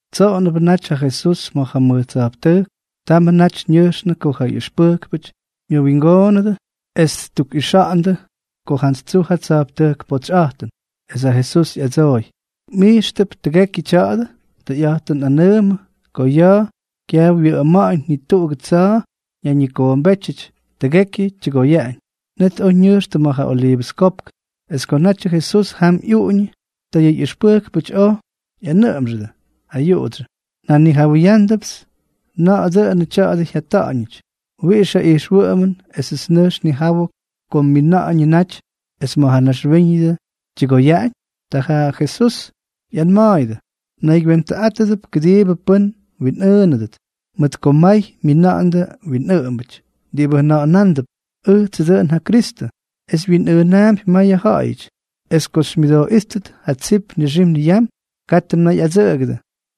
Tsoꞌonʉbʉ naty ja Jesús ma̱ ja mʉj tsa̱jptʉjk. Tamʉ naty ñʉjxnʉ ko ja ꞌyʉxpʉjkpʉty myʉwingoonʉdʉ es ttukꞌixa̱ꞌa̱ndʉ ko jantsy tsuj ja tsa̱jptʉjk potsyꞌa̱jtʉn. Es ja Jesús ꞌyadsooy: —¿Mꞌijxtʉp tʉgekyʉ tya̱a̱dʉ? Tʉyꞌa̱jtʉn nꞌanʉʉmʉ ko ya̱a̱ kyaj wyʉꞌʉma̱ꞌa̱ñ ni tuꞌugʉ tsa̱a̱ ñayñikoombétyʉty, tʉgekyʉ tyʉgoyaꞌañ. Net oj ñʉjxtʉ ma̱ ja Oliivʉs Kopk. Es ko natyʉ Jesús jam ꞌyuꞌuñʉ, ta yʉ ꞌyʉxpʉjkpʉty oj ꞌyanʉꞌʉmxʉdʉ ayuꞌudsyʉ: —Njanijawʉyándʉpts na̱ꞌa̱ dʉnʉ tya̱a̱dʉ jyata̱ꞌa̱ñʉty. ¿Wiꞌix ja ijxwʉꞌʉmʉn esʉts nʉjx nnijawʉ ko mmina̱ꞌa̱ñʉ naty es ma̱ ja naxwíñʉdʉ tyʉgoyaꞌañ? Ta Jesús ꞌyanma̱a̱yʉdʉ: —Mnaygywentʉꞌátʉdʉp kʉdiibʉ pʉ́n mwinꞌʉʉnʉdʉt. Mʉt ko may myina̱ꞌa̱ndʉ winꞌʉꞌʉmbʉty diꞌibʉ jʉna̱ꞌa̱na̱a̱mp: “Ʉjtsʉ dʉꞌʉn ja Kristʉ”, es wyinꞌʉʉnaampy mayʉ ja̱ꞌa̱yʉty. Es ko xymyʉdooꞌíttʉt ja tsip nixim niyam, katʉ mnayꞌadsʉꞌʉgʉdʉ.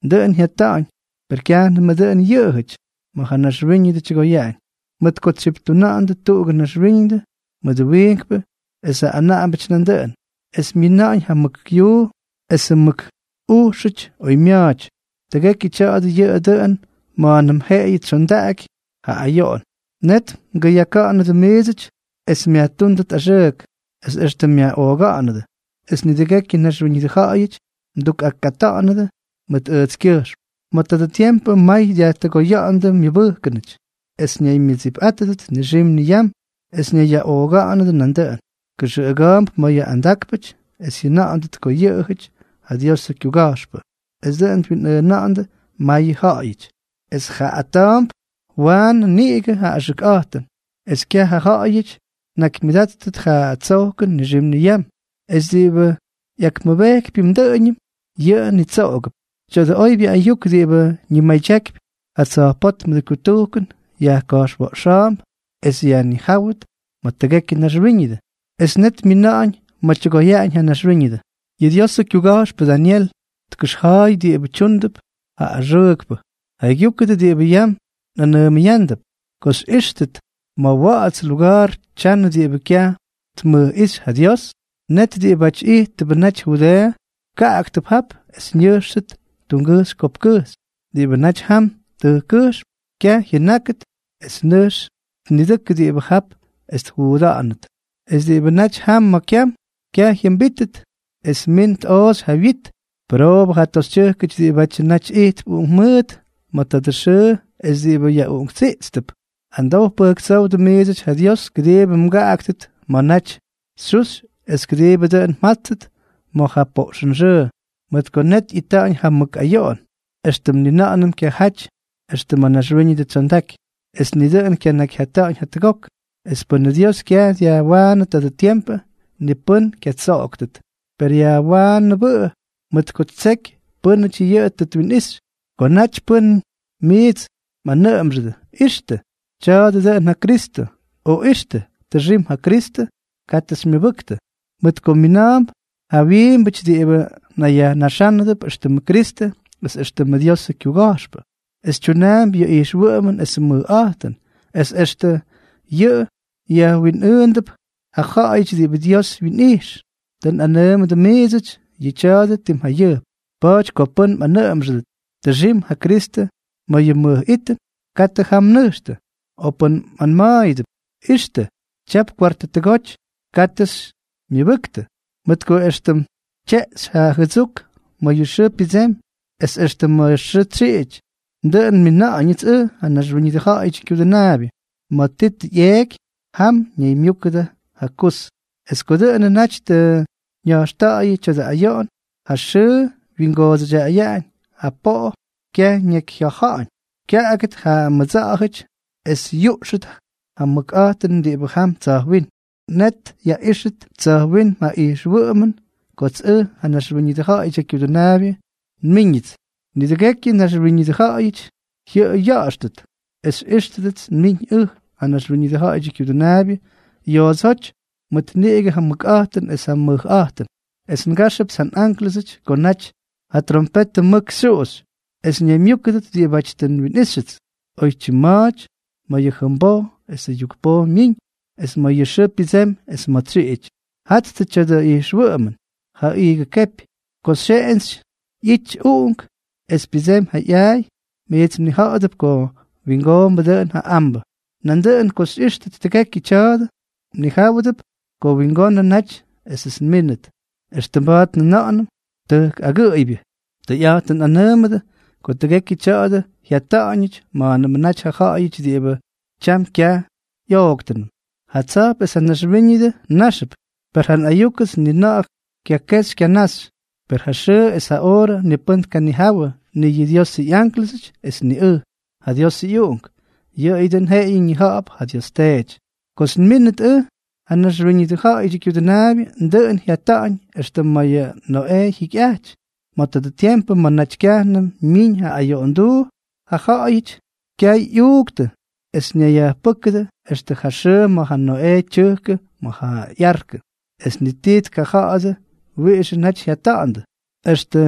Dʉꞌʉn jyata̱ꞌa̱ñ, per kyajnʉm dʉꞌʉn yʉꞌʉjʉty ma̱ ja naxwíñʉdʉ tyʉgoyaꞌañ, mʉt ko tsyiptuna̱ꞌa̱ndʉ tuꞌugʉ naxwíñʉdʉ mʉdʉ wiinkpʉ esʉ anaꞌambʉty nandʉꞌʉn, es myina̱ꞌa̱ñ ja mʉk yuu esʉ mʉk ujxʉty oymya̱a̱ty. Tʉgekyʉ tya̱a̱dʉ yʉꞌʉ dʉꞌʉn ma̱a̱nʉm jeꞌeyʉ tsyondaꞌaky ja ayoꞌon. ’Net mgʉyaka̱ꞌa̱nʉdʉ miidsʉty es myajtúndʉt axʉʉk, es extʉ myaꞌooga̱ꞌa̱nʉdʉ; es nidʉgekyʉ naxwíñʉdʉ ja̱ꞌa̱yʉty mdukꞌakꞌata̱ꞌa̱nʉdʉ mʉt ʉjtskyʉjxm. Ma̱ tadʉ tiempʉ may dyajtʉgoya̱ꞌa̱ndʉ myʉbʉjkʉnʉty, es ñaymyʉdsipꞌátʉdʉt nixim niyam es ñayyaꞌooga̱ꞌa̱nʉdʉ nandʉꞌʉn. Kʉxʉꞌʉga̱a̱mp mayʉ andákpʉty es jyʉna̱ꞌa̱ndʉt ko yʉꞌʉjʉty ja Diosʉ kyuga̱jxpʉ, es dʉꞌʉn twinꞌʉʉna̱ꞌa̱ndʉ mayʉ ja̱ꞌa̱yʉty. Es jaaꞌata̱a̱mp waanʉ niꞌigʉ ja axʉkꞌa̱jtʉn, es kyaj ja ja̱ꞌa̱yʉty tnakymyʉdáttʉt ja tsojkʉn nixim niyam. Es diꞌibʉ ꞌyakmʉbejkypyʉm dʉꞌʉñʉm, yʉꞌʉ nitsoꞌogʉp. Tya̱dʉ oybyʉ ayuk diꞌibʉ ñimadyakypy ja tsa̱jpótmʉdʉ kutujkʉn yajka̱jxwa̱ꞌxa̱a̱mp es yajknijáwʉt ma̱ tʉgekyʉ naxwíñʉdʉ, es net myina̱ꞌa̱ñ ma̱ tyʉgoyaꞌañ ja naxwíñʉdʉ. ’Yʉ Diosʉ kyuga̱jxpʉ Dañel tkʉxja̱a̱y diꞌibʉ tyúndʉp ja axʉʉkpʉ. Jaygyúkʉdʉ diꞌibʉ yam nꞌanʉʉmʉyándʉp. Ko xyꞌíxtʉt ma̱ wa̱ꞌa̱ts luga̱a̱r tyanʉ diꞌibʉ kyaj tmʉjꞌíxy ja Dios, net diꞌibáty ijttʉbʉ naty Judeeʉ, kaꞌaktʉp jap es ñʉjxtʉt tungʉjxy kopkkʉjxy. Diꞌibʉ naty jam tʉjkkʉjxm, kyaj jyʉnákʉt es nʉjx tnidʉkʉ diꞌibʉ jap es tjuuda̱ꞌa̱nʉt. Es diꞌibʉ naty jam kyam, kyaj jyʉmbítʉt es min tꞌooxy ja wyit. ¡Pʉroobʉ ja toxytyʉjkʉty diꞌibʉ naty ijtp uꞌunkmʉʉt ma̱ tadʉ xʉʉ es diꞌibʉ yaꞌuꞌunktsiꞌtstʉp! Amdow pʉjktsówdʉ miidsʉty ja Dios kʉdiibʉ mgaꞌaktʉt ma̱ naty xyuxy es kʉdiibʉ dʉꞌʉn mjáttʉt ma̱ ja poꞌxʉnxʉʉ. Mʉt ko net ꞌyita̱ꞌa̱ñ ja mʉk ayoꞌon, éxtʉm ni na̱ꞌa̱nʉm kyajaty extʉ ma̱ naxwíñʉdʉ tsyondaky, es ni dʉꞌʉn kyanakyjyata̱ꞌa̱ñʉty jatʉgok. Es pʉnʉ Dios kyaj dyajwaanʉ tadʉ tiempʉ, ni pʉ́n kyatsoꞌoktʉt, per yajwaanʉbʉꞌʉ mʉt ko ttseky pʉ́nʉty yʉꞌʉ tʉ twinꞌixy. ’Ko naty pʉ́n miits mꞌanʉꞌʉmxʉdʉ: “¡Ixtʉ!, tya̱a̱dʉ dʉꞌʉn ja Kristʉ”, o “¡Ixtʉ!, tʉxim ja Kristʉ”, katʉ xymyʉbʉktʉ. Mʉt ko mina̱a̱mp ja winꞌʉꞌʉmbʉty diꞌibʉ nayyajnaxánʉdʉp éxtʉmʉ Kristʉ es éxtʉmʉ Diosʉ kyuga̱jxpʉ, es tyunaampy yʉ ijxwʉꞌʉmʉn esʉ mʉjꞌa̱jtʉn, es extʉ yʉꞌʉ jyawinꞌʉʉnándʉp ja ja̱ꞌa̱yʉty diꞌibʉ Dios wyinꞌijx. Tʉ nꞌanʉʉmʉdʉ miidsʉty yʉ tya̱a̱dʉ tim jayʉjp. Pa̱a̱ty ko pʉ́n mꞌanʉꞌʉmxʉdʉt: “Tʉxim ja Kristʉ ma̱ yʉ mʉj itʉn”, katʉ jam mnʉjxtʉ. O pʉ́n mꞌanma̱a̱yʉdʉp: “¡Ixtʉ!, tyap kwartʉ tʉgoty”, katʉ xymyʉbʉktʉ. Mʉt ko éxtʉm tyeꞌxy ja jʉdsuk ma̱ yʉ xʉʉ pyʉdsemy es extʉ ma̱ xʉʉ tsyiꞌity, dʉꞌʉn nmina̱ꞌa̱ñʉts ʉj, ja Naxwíñʉdʉ Ja̱ꞌa̱yʉdyʉ Kyudʉnaabyʉ. Ma̱ ti tʉ ꞌyeeky, jam ñaymyúkʉdʉ ja kus. ’Es ko dʉꞌʉnʉ naty tʉ ña̱jxta̱ꞌa̱yʉ tadʉ ayoꞌon, ja xʉʉ wyingoodsʉyaꞌañ, ja poꞌo kyaj ñakyjya̱ja̱ꞌa̱ñ, kya̱ꞌa̱dʉt ja mʉdsa̱ꞌa̱jʉty es yuꞌxʉt ja mʉkꞌa̱jtʉn diꞌibʉ jam tsa̱jwínm. Net yaꞌíxʉt tsa̱jwínm ja ijxwʉꞌʉmʉn kots ʉj, ja Naxwíñʉdʉ Ja̱ꞌa̱yʉdyʉ Kyudʉnaabyʉ, nmíñʉts. Nidʉgekyʉ naxwíñʉdʉ ja̱ꞌa̱yʉty jyʉꞌʉy ya̱ꞌa̱xtʉt es xyꞌíxtʉdʉts nmiñ ʉj, ja Naxwíñʉdʉ Ja̱ꞌa̱yʉdyʉ Kyudʉnaabyʉ, yoodsóty mʉt niꞌigʉ ja mʉkꞌa̱jtʉn es ja mʉjꞌa̱jtʉn. Es ngáxʉpts ja nꞌánklʉsʉty ko naty ja trompetʉ mʉk xyuꞌuxy, es ñaymyúkʉdʉt diꞌibáty tʉ nwinꞌíxtʉts oytyim ma̱a̱ty, ma̱ yʉ jʉmboj esʉ yukpoj myiñ es ma̱ yʉ xʉʉ pyʉdsemy es ma̱ tsyiꞌity. ’Jattʉ tya̱dʉ ꞌyijxwʉꞌʉmʉn ja iigʉ kepy. Ko ja xyeꞌentsy ꞌyity uꞌunk, es pyʉdsemy ja ꞌyaay, miits mnija̱ꞌa̱dʉp ko wingoombʉ dʉꞌʉn ja ambʉ. Nandʉꞌʉn ko xyꞌíxtʉt tʉgekyʉ tya̱a̱dʉ, mnijáwʉdʉp ko wingonʉ naty esʉts nmínʉt, éxtʉm mba̱a̱t njʉna̱ꞌa̱nʉm tʉjk agʉꞌʉybyʉ. Tʉyꞌa̱jtʉn nꞌanʉʉmʉdʉ ko tʉgekyʉ tya̱a̱dʉ jyata̱ꞌa̱ñʉty ma̱a̱nʉmʉ naty ja ja̱ꞌa̱yʉty diꞌibʉ tyam kyaj ꞌyooktʉnʉm. Ja tsa̱jp es ja naxwíñʉdʉ náxʉp, per ja nꞌayúkʉts ni na̱ꞌa̱ kyakexy kyanaxy. ’Per ja xʉʉ es ja oorʉ ni pʉ́n tkanijawʉ, ni yʉ Diosʉ ꞌyánklʉsʉty es ni ʉj, ja Diosʉ ꞌyUꞌunk, yʉꞌʉyʉ dʉꞌʉn jeꞌeyʉ ñija̱ꞌa̱p ja Dios Teety. ’Kots nmínʉt ʉj, ja Naxwíñʉdʉ Ja̱ꞌa̱yʉdyʉ Kyudʉnaabyʉ, dʉꞌʉn jyata̱ꞌa̱ñ éxtʉm ma̱ ja Noꞌee jyikyꞌaty. Ma̱ tadʉ tiempʉ ma̱ naty kyajnʉm myiñ ja ayoꞌonduu, ja ja̱ꞌa̱yʉty kyay ꞌyuuktʉ es ñayyajpʉ́kʉdʉ extʉ ja xʉʉ ma̱ ja Noꞌee tyʉjkʉ ma̱ ja ꞌyarkʉ. Es ni ti tkaja̱ꞌa̱dʉ wiꞌixʉ naty jyata̱ꞌa̱ndʉ extʉ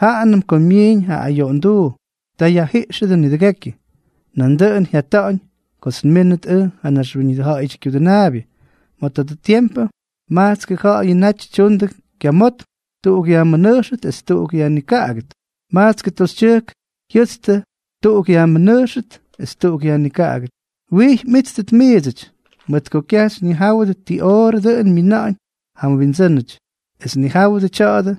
jaanʉm ko myiiñ ja ayoꞌonduu. Ta yajjiꞌxʉdʉ nidʉgekyʉ. Nandʉꞌʉn jyata̱ꞌa̱ñ kots nmínʉt ʉj, ja Naxwíñʉdʉ Ja̱ꞌa̱yʉdyʉ Kyudʉnaabyʉ. Ma̱ tadʉ tiempʉ majtskʉ ja̱ꞌa̱yʉ naty tyundʉ kyamotm, tuꞌuk yajmʉnʉjxʉt es tuꞌuk yajnikaꞌagʉt. Majtskʉ toxytyʉjk jyʉtstʉ, tuꞌuk yajmʉnʉjxʉt es tuꞌuk yajnikaꞌagʉt. ’Wijy mꞌíttʉt miidsʉty, mʉt ko kyaj xyñijáwʉdʉ ti oorʉ dʉꞌʉn myina̱ꞌa̱ñ ja mWindsʉ́nʉty. Es nijáwʉdʉ tya̱a̱dʉ,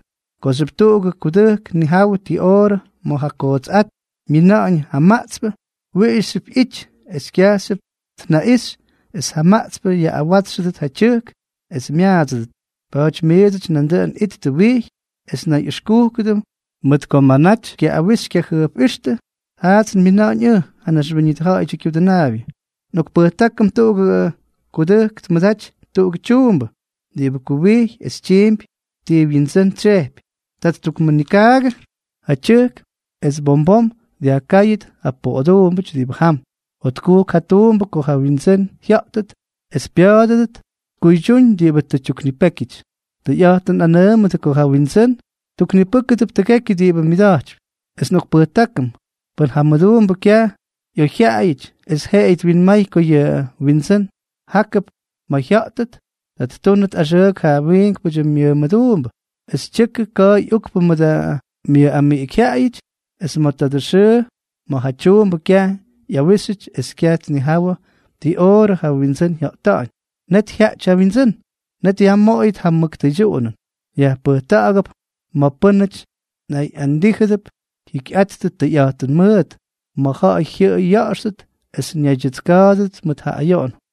kooxyʉp tuꞌugʉ kudʉjk tnijawʉ ti oorʉ ma̱ ja kootsꞌát myina̱ꞌa̱ñ ja maꞌtspʉ, wijyxyʉp ꞌyity es kyajxyʉp tnaꞌixy es ja maꞌtspʉ yaꞌꞌawátsxʉdʉt ja tyʉjk es myaadsʉdʉt. Pa̱a̱ty miidsʉty nandʉꞌʉn ittʉ wijy es nayꞌʉxkúkʉdʉ, mʉt ko ma̱ naty xykyaꞌꞌawix xykyajʉjpꞌíxtʉ, jaats nmina̱ꞌa̱ñ ʉj, ja Naxwíñʉdʉ Ja̱ꞌa̱yʉdyʉ Kyudʉnaabyʉ. ’Nꞌokpʉjtákʉm tuꞌugʉ kudʉjk tmʉdaty tuꞌugʉ tyuumbʉ diꞌibʉ kuwijy es tyiimpy ti wyindsʉ́n tsyejpy. Ta ttukmʉnikaagʉ ja tyʉjk es bom bom dyajkáyʉt ja poꞌoduumbʉty diꞌibʉ jam. Jotkujk ja tuumbʉ ko ja wyindsʉ́n jya̱ꞌtʉt es pya̱a̱dʉdʉt tkuydyúñ diꞌibʉ tʉ yajtuknipéky. Tʉyꞌa̱jtʉn nꞌanʉʉmʉdʉ ko ja windsʉ́n ttuknipʉ́kʉdʉp tʉgekyʉ diꞌibʉ myʉda̱jtypy. Es nꞌokpʉjtákʉm, pʉn ja mʉduumbʉ kyaj ꞌyoyjyaꞌayʉty es jeꞌeyʉ twinmay ko yʉ wyindsʉ́n jákʉp ma̱ jya̱ꞌtʉt, ta ttúnʉt axʉʉk ja wiinkpʉdyʉ myʉmʉduumbʉ, es tyʉkʉ ka̱a̱y ukpʉ mʉdʉ myʉꞌamiꞌikyjyaꞌayʉty, es ma̱ tadʉ xʉʉ ma̱ ja tyuumbʉ kyaj ꞌyawíxyʉty es kyaj tnijawʉ ti oorʉ ja wyindsʉ́n jya̱ꞌta̱ꞌa̱ñ, net jyaꞌty ja wyindsʉ́n. Net yajmoꞌoyʉt ja mʉk tʉydyuꞌunʉn, yajpʉjta̱ꞌa̱gʉp ma̱ pʉ́nʉty nayꞌandíjʉdʉp jyikyꞌattʉ tʉyꞌa̱jtʉn mʉʉt, ma̱ ja̱ꞌa̱y jyʉꞌʉy ya̱ꞌa̱xtʉt es ñaydyʉtska̱a̱dʉdʉt mʉt ja ayoꞌon.